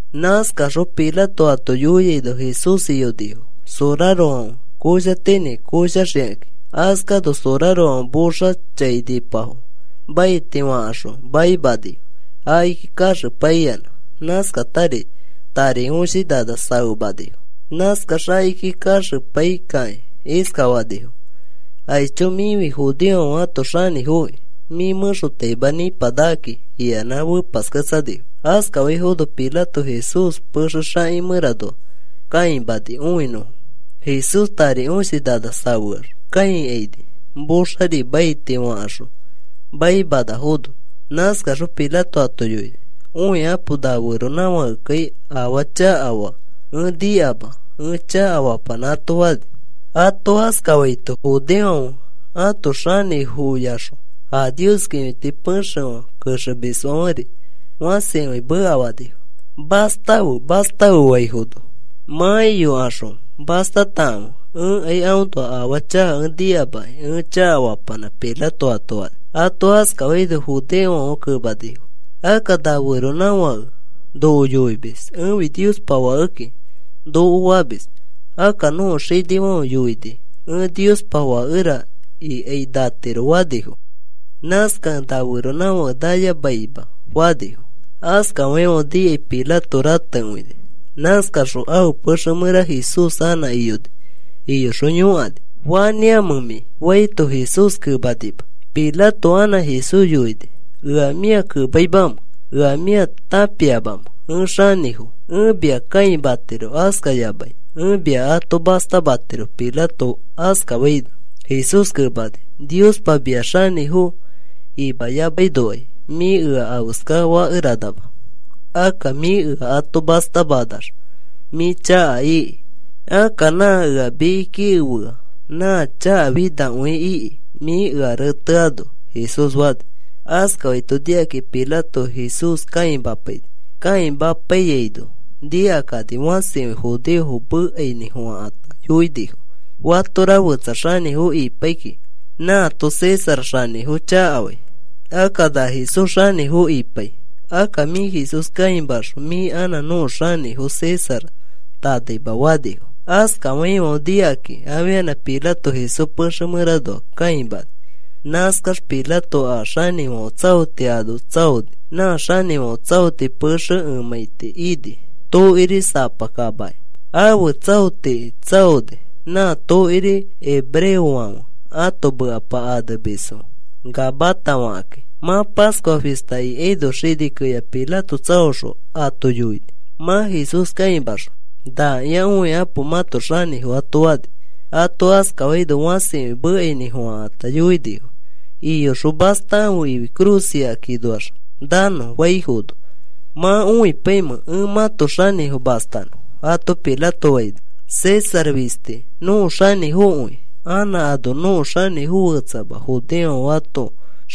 Nãskaxõ Pilato ato yoiano Jesús iyonifo sorarofãfe koshatinĩ koshaxikakĩ. Askano sorarofãfe moxa chainipafo maiti fakaxõ maimanifo. Akiki kaxepaiyanã nãskatari tari õshi nana safemanifo. Nãskax akiki kaxepai kakĩ iskafanifo: “Aicho. Mĩfi judeofãfe ãto xanĩfoki. Mĩ mẽxotaima nipanakaki,” iyanã fepasketsanifo. Askafaifono Pilato Jesús pexe xaki mẽranoa kãimani õinõfo. Jesús tari õshi nana safeax kãikaini, moxari maiti fakaxõ maimanafono. Nãskaxõ Pilato ato yoini: “Õikapo na feronãfakekai afaa chakafaa ẽ nikama ẽ chakafapanã,” ato fani. Ato askafaito judeofãfe ãto xanĩfoyaxõ a Nios kĩfiti pexefã kexemisfãferi fãsikõi mekafanifo: “¡Mastafe! ¡Mastafe!” faifono, “Mã iyokaxõ mastatakãfe. Ẽkai aõnoa afaa chaka ẽ nikama ẽ chakafapanã,” Pilato ato fani. Ato askafaino judeofãfe kemanifo: “Akka na feronãfãke noko yoimis: ‘Ẽfi Niospa fakeki,’ noko famis. Akka nõko xinifãfe yoini: ‘Ẽ Niospa fakera ikai natiro,’ fanifo. Nãskakẽ na feronãfake nayamaima,” fanifo. Askafaifãfe nikai Pilato ratekõini. Nãskaxõ ãfe pexe mẽra Jesús anã iyoni. Iyoxõ yõkani: “¿Fanĩamẽ mĩ?” faino, Jesús kemanima. Pilato anã Jesús yoini: “¿Ea mĩa kemaimamẽ? ¿Ea mĩa tãpiamamẽ ẽ xanĩfo? Ẽ mia kãimatiro, askayamai ẽ mia ato mastamatiro,” Pilato askafaino, Jesús kemani: “Niospa mia xanĩfo imayamainokai mĩ ea afeska fakeranama. Akka mĩ ea ato mastamanax mĩ chaka iki. Akka nã ea mikiki efea nã chakafinakõi iki mĩ ea reteano,” Jesús fani. Askafaito nikakĩ Pilato Jesús kãimapaini. Kãimapaiyaino nikakani fãsikõi judeofo mekainĩfofãkata yoinifo: “Fatora fetsa xanĩfo ipaikĩ nãato César xanĩfo chakafai. Akka na Jesús xanĩfo ipai. Akka mĩ Jesús kãimaxõ mĩ anã nõko xanĩfo César tanaima,” fanifo. Askafaifãfe nikakĩ afianã Pilato Jesús pexe mẽranoa kãimani. Nãskax Pilato a xanĩfãfe tsaoti ano tsaoni. Nã xanĩfãfe tsaoti pexe emãiti ini tokiri sapa kamaki ãfe tsaotiki tsãoni. Nã tokiri hebreofãfe ãto mekapa anemisfo Gabata fakakĩ. Mã Pascua fista ikaino xini keya Pilato tsaoxõ ato yoini mã Jesús kãimaxõ, “Nakĩa õikapo mãto xanĩfo,” ato fani. Ato askafaino fãsikõi mekainĩfofãkata yoinifo: “¡Iyoxõ mastatãfe ifi cruz ikikakĩnoax nanõ!” faifono, “¿Mã õipaimẽ ẽ mãto xanĩfo mastanõ?” ato Pilato faino, “César fisti nõko xanĩfokõi. Anã ano nõko xanĩfo fetsama,” judeofãfe ãto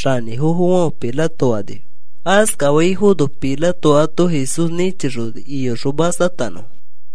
xanĩfofofãfe Pilato fanifo. Askafaifono Pilato ato Jesús nĩchixoni iyoxõ mastatanõfo.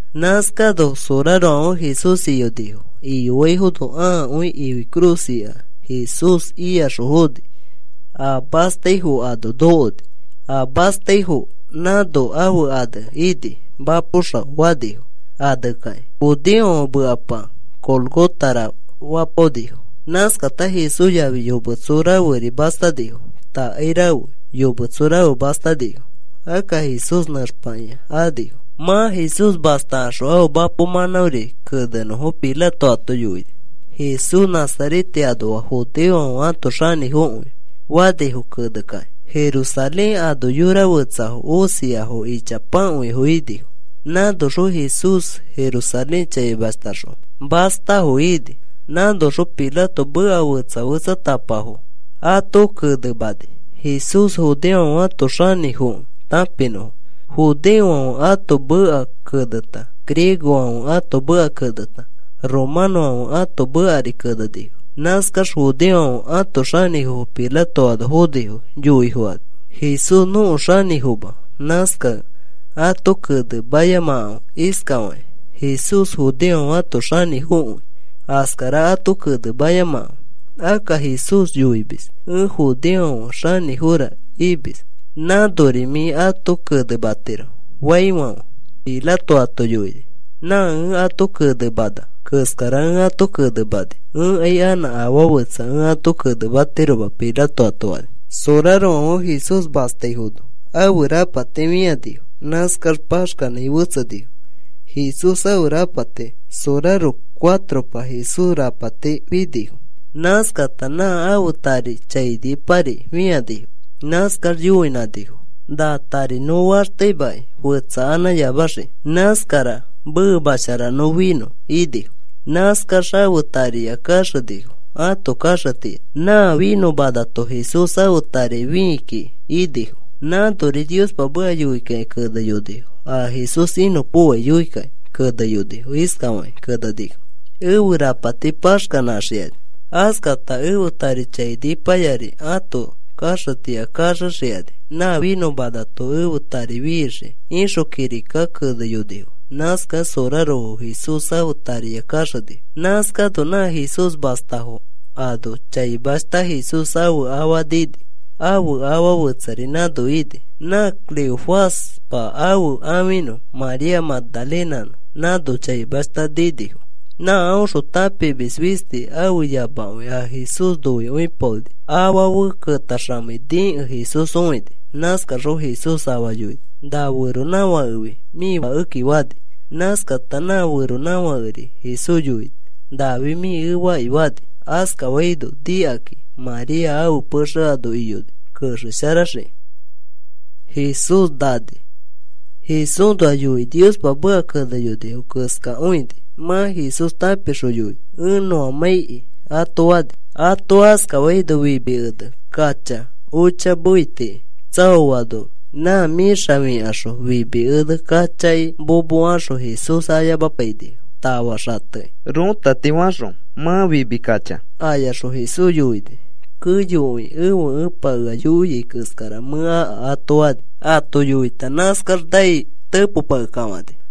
Nãskano sorarofãfe Jesús iyonifo. Iyoaifono ãakõi ifi cruz ika Jesús iyaxõ foni. A mastaifo ano nokoni. A mastaifo nãno ãfe ane ini: “Mapo Xao,” fanifo anekakĩ. Judeofãfe mekapa Gólgotara fapaonifo. Nãskata Jesús yafi yometso raferi mastanifo. Takai rafe yometso rafe mastanifo. Akka Jesús nẽxpakĩa anifo. Mã Jesús mastakaxõ ãfe mapo mãnãori kenenõfo Pilato ato yoini. “Jesús Nazarete anoa judeofãfe ãto xanĩfokõi,” fanifo kene kakĩ. Jerusalén ano yora fetsafo osiafo ichapakõifo inifo. Nãnoxõ Jesús Jerusalén chaimashtaxõ mastafo ini. Nãnoxõ Pilato meka fetsa fetsatapafo ato kenemani Jesús judeofãfe ãto xanĩfokẽ tãpinõfo. Judeofãfe ãto meka keneta, griegofãfe ãto meka keneta, romanõfãfe ãto mekari kenenifo. Nãskax judeofãfe ãto xanĩfofo Pilato ano fonifo yoi fokani: “Jesús nõko xanĩfoma. Nãskakẽ ato kenemayamafe iskafakĩ: ‘Jesús judeofãfe ãto xanĩfokõi,’ askara ato kenemayamafe. Akka, ‘Jesús yoimis, “Ẽ judeofãfe xanĩfora” imis.’ Nãnori mĩ ato kenematiro,” faifãfe, Pilato ato yoini: “Nã ẽ ato kenemana keskara ẽ ato kenemani. Ẽkai anã afaa fetsa ẽ ato kenematiroma,” Pilato ato fani. Sorarofãfe Jesús mastaifono ãfe rapati fĩanifo. Nãskax paxkanãi fetsenifo Jesús ãfe rapati soraro cuatropa Jesús rapati finifo. Nãskata nã ãfe tari chainipari fĩanifo. Nãskax yoinãnifo: “Nã tari nõ faxteimãkai fetsakanãyamaxikĩ. Nãskara memashara nõ finõ,” inifo. Nãskax ãfe tariya kaxenifo ãto kaxetiya. “Na finõmanato Jesús ãfe tari fii kiki,” inifo. Nãnori Niospa meka yoikakĩ keneyonifo. A Jesús inõpokoai yoikakĩ keneyonifo. Iskafakĩ kenenifo: “Ẽfe rapati paxkanãxikani. Askata ẽfe tari chainipayari ãto kaxetiya kaxexikani. Nã finõmanato ẽfe tari fixii,” ixõ kirika keneyonifo. Nãskakẽ sorarofo Jesús ãfe tariya kaxenifo. Nãskano nã Jesús mastafo ano chaimashta Jesús ãfe afa nini. Ãfe afa fetsari nãno nini. Nã Cleofaspa ãfe ãfinõ María Magdalenanõ nãno chaimashta ninifo. Nã aõxõ tãpimis fisti ãfe yamakõi a Jesús noikõipaoni afa fe ketaxamei nikẽ Jesús õini. Nãskaxõ Jesús afa yoini: “Na feronãfakefi mĩ fakeki,” fani. Nãskata nã feronãfakeri Jesús yoini: “Nafi mĩ efaki,” fani. Askafaino nikakĩ María ãfe pexe ano iyoni kexesharaxikĩ. Jesúsnoa yoikĩ Niospa meka keneyonifo keskakõini. Mã Jesús tãpixõ yoini: “Ẽ nõamãiki,” ato fani. Ato askafaino fimi ene kacha ocha mefetiki tsaoano nã mĩxa fikaxõ fimi ene kachaki momokaxõ Jesús ayamapainifo tafa xatekĩ rõtati fakaxõ. Mã fimi kacha ayaxõ Jesús yoini: “Keyokõi ẽfe Ẽpa ea yoia keskara mẽ aka,” ato fani. Ato yoita nãskax nai tepopakekafãni.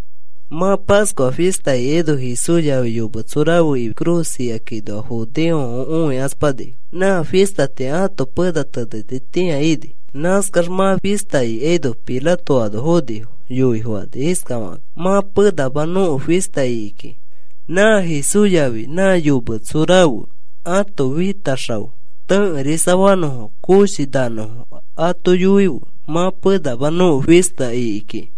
Mã Pascua fista ikaino Jesús yafi yometso rafe ifi cruz ikakĩnoa judeofãfe õikaspanifo. Nã fistatĩa ato pena tenetitĩa ini. Nãskax mã fista ikaino Pilato ano fonifo yoi fokani iskafakakĩ: “Mã penama nõko fista iki kiki. Nã Jesús yafi nã yometso rafe ãto fitax xao tẽkerisa fanõfo koshi nanõfo ato yoife. Mã penama nõko fista iki kiki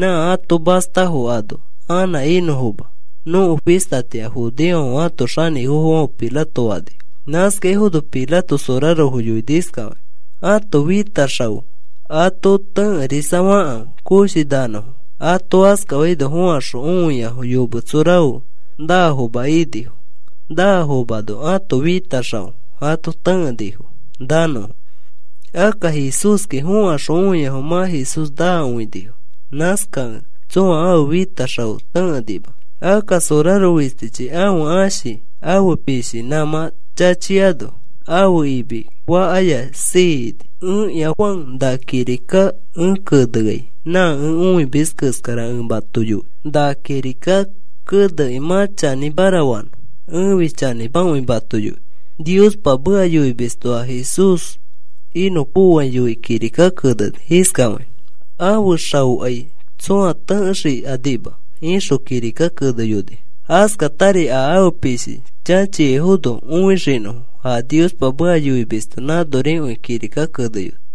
nã ato mastafo ano anã inõfoma nõko fistatĩa,” judeofãfe ãto xanĩfofofãfe Pilato fanifo. Nãskafaifono Pilato sorarofo yoini iskafakĩ: “Ãto fitax xao ato tẽkerisa fakãfe koshi nanõfo.” Ato askafaino fokaxõ õiafo yometso rafe naafoma inifo. Naafomano ãto fitax xao ato tãkenifo nanõfo. Akka Jesúski fokaxõ õiafo mã Jesús naa õinifo. Nãskakẽ tsõa ãfe fitax xao tẽkenima. Akka soraro fistichi ãfe ãshi ãfe pishi nãmã chachiaino ãfe imi fakaya siini. Ẽkĩa Juan na kirika ẽ keneai nã ẽ õimis keskara ẽ mato yoi na kirika kenekĩ mã chanĩmara fanõ. Ẽfi chanĩmakõi mato yoi. Niospa meka yoimisto a Jesús inõpokoai yoikĩ kirika keneni iskafakĩ: “Ãfe xaokai tsõa tẽkexikanima,” ixõ kirika keneyonifo. Askatari, “A ãfe pishi chachiaifono õixinõfo,” a Niospa meka yoimisto nãnorikõi kirika keneyoni.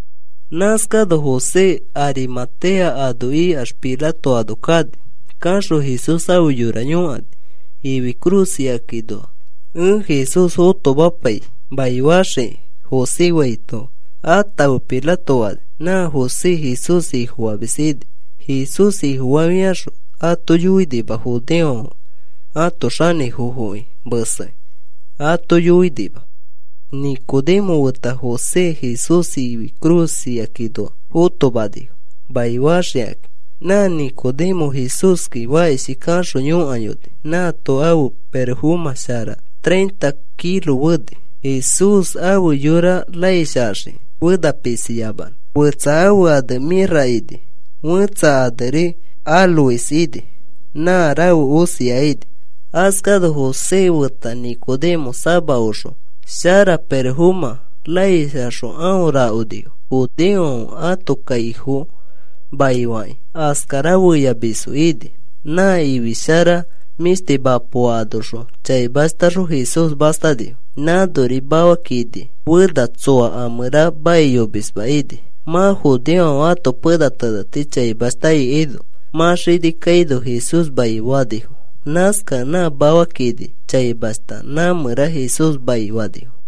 Nãskano José Arimatea ano ikax Pilato ano kani. Kaxõ Jesús ãfe yora yõkani: “Ifi cruz ikakĩnoa ẽ Jesús fotomapai maifaxikĩ,” José faito, “Atãfe,” Pilato fani. Nã José Jesús Ifofamis ini. Jesús Ifofafiaxõ ato yoinima. Judeofãfe ãto xanĩfofoki mesekĩ ato yoinima. Nicodemo feta José Jesús ifi cruz ikakĩnoa fotomanifo maifaxikakĩ. Nã Nicodemo Jesúski fakishi kaxõ yõkayoni. Nãato ãfe pirofomã shara treinta kilo feni Jesús ãfe yora raish axiki fena pisiyamanõ. Fetsa ãfe ane mĩrra ini. Fẽtsa aneri áloes ini. Nã rafe osia ini. Askano José feta Nicodemo sama oxo shara pirofomã raish axõ aõ rakonifo. Judeofãfe ãto kaifo maifakĩ askara feyafamisfo ini. Nã ifi shara mĩshti mapoa anoxõ chaimashtaxõ Jesús mastanifo. Nãnori mafa kini fena, tsoa a mẽra maiyomisma ini. Mã judeofãfe ãto pena teneti chaimashta ikaino mã xini kaino Jesús maifanifo. Nãskakẽ nã mafa kini chaimashta nã mẽra Jesús maifanifo.